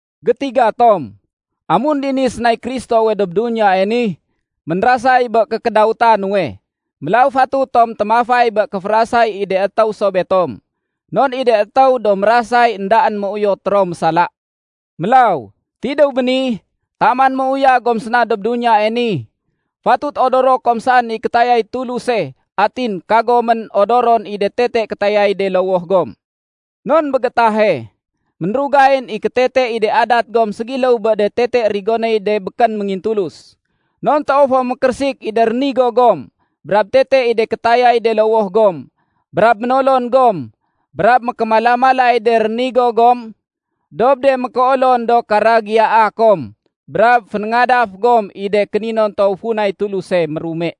Gétiga tom, amun dini sénay Kristowe dob duniyae ni, ménrasay bé kékédawéta nuwe. Mélaw fatut tom témafay bé kéférasay i de étéw so betom. Non i de étéw do mérasay éndaén méuyot ro mésala. Mélaw, tidéw béni, taman méuyag gom séna dob duniyae ni, fatut odoro kom saén i kétayay Tuluse atin kagomén odoron i de tete kétayay de lowoh gom. Non bé gétahe, ménrugayén i kétete i de adat gom ségiléw bé de tete rigonéy de békén méngintulus. Non toow fo mékérésik i de rénigo gom, brab tete i de kétayay de lowoh gom, brab ménolon gom, brab mékémala-malay de rénigo gom dob de mékéolon do karagiyaa kom, brab fénéngadaf gom i de kéninontow funay Tuluse mérume.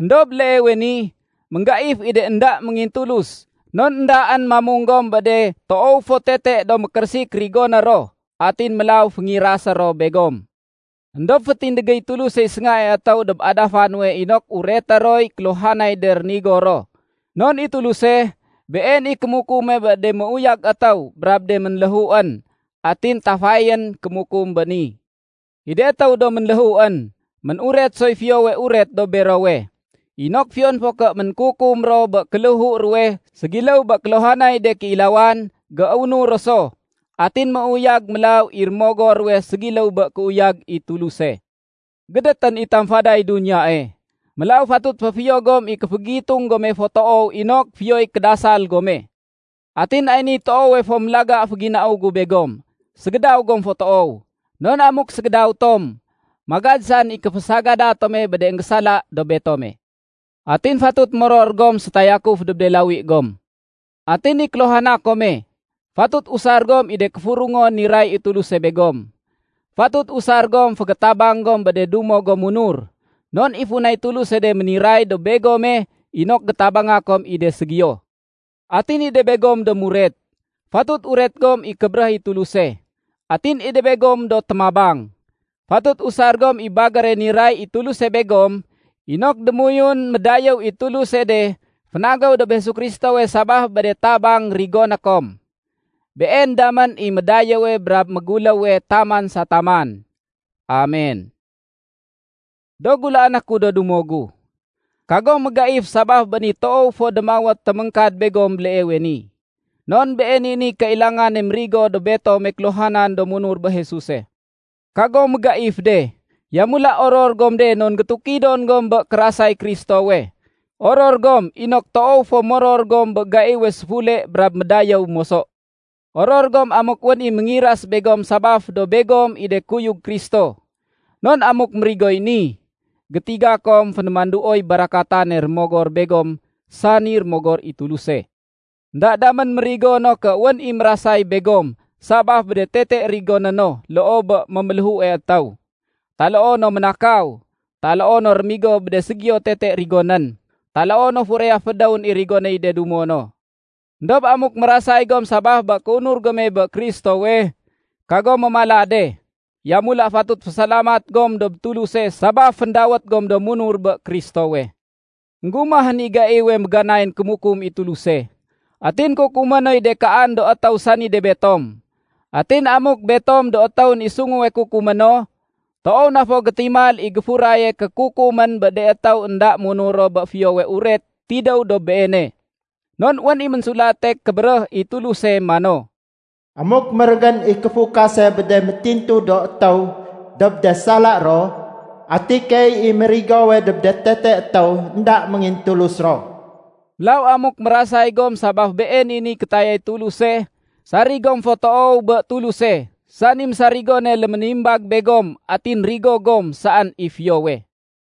Endob béleewe ni, ménggaif i de énda méngintulus non éndaén mamung gom bé de toow fo tete do mékérésik rigoné ro. Atin mélaw féngirasé ro begom. Endob fétindégéy Tulusey séngae étéw dob adafa nuwe inok ureté roy kéluhanay de rénigo ro. Non i Tuluse, Been i kémukume bé de méuyag étéw brab de ménléhuén. Atin tafayén kémukum béni. I de étéw do ménléhuén, mén-uret soy Fiyowe Uret dob berowe, inok fiyon fo ké ménkukum ro bé kéléhu ruwe ségiléw bé kéluhanay de kéilawan, géunur ro so, atin méuyag mélaw i rémogor ruwe ségiléw bé kéuyag i Tuluse. Gédétén i tamfaday duniyae. Mélaw fatut féfiyo gom i kéfégitung gome fo toow inok fiyoy kédasal gome. Atin ay niy toowe fo mélaga féginau gu begom: Ségédaw gom fo toow. Non amuk ségédaw tom, magad saén i kéfésagada tome bé de énggésala dob betome. Atin fatut moror gom sétayakuf dob de lawi gom. Atin i kéluhana kome, fatut usar gom i de kéfurungon niray i Tuluse begom. Fatut usar gom fégétabang gom bé de dumo gom munur. Non i funay Tuluse de méniray dob begome inok gétabanga kom i de ségiyo. Atin i de begom do muret, fatut uret gom i kébéréh i Tuluse. Atin i de begom do témabang, fatut usar gom i bagére niray i Tuluse begom inok démoyun médayéw i Tuluse de fénagéw dob Jesu Kristowe sabaf bé de tabang rigoné kom. Been damén i médayéwe brab méguléwe taman sa taman. Amen! Do gulaané ku do dumo gu, kagom mégaif sabaf bé ni toow fo démawét téméngkad begom béleewe ni. Non been i niy kailangane mérigo dob betome kéluhanan do munur bé Jesuse. Kagom mégaif de, yamula oror gom de non gétukidon gom bé kérasay Kristowe. Oror gom inok toow fo moror gom bé gaiwe séfule brab médayéw moso. Oror gom amuk wén i méngiras begom sabaf do begom i de kuyug Kristo. Non amuk mérigoy ni, gétiga kom fénémanduoy barakatane Rémogor begom, sani Rémogor i Tuluse. Enda damén mérigo no ké wén i mérasay begom sabaf bé de tete rigoné no loo bé méméléhue étéw, taloo no ménakaw, taloo no rémigo bé de ségiyo tete rigonén, taloo no furaya fédéwén i rigonéy de dumo no. Endob amuk mérasay gom sabaf bé kéunur gome bé Kristowe, kagom mémala de. Yamula fatut fésalamat gom dob Tuluse sabaf féndawét gom do munur bé Kristowe. Enggumahén i gaiwe méganayén kémukum i Tuluse. Atin kukumé noy de kaan do étéw sani de betom. Atin amuk betom do étéwén i sunguwe kukumé no, toow na fo gétimal i géfuraye kékukumén bé de étéw énda munur ro bé Fiyowe Uret tidéw dob Beene. Non wén i Ménsulate Kébéréh i Tuluse mano, “Amuk mérégén i kéfukase bé de métintu do étéw dob de sala ro, ati keey i mérigowe dob de tete étéw énda méngintulus ro?” Mélaw amuk mérasay gom sabaf been i niy kétayay Tuluse, sarig gom fo toow bé Tuluse, sani mésarigone léménimbag begom, atin rigo gom saén i fiyowe.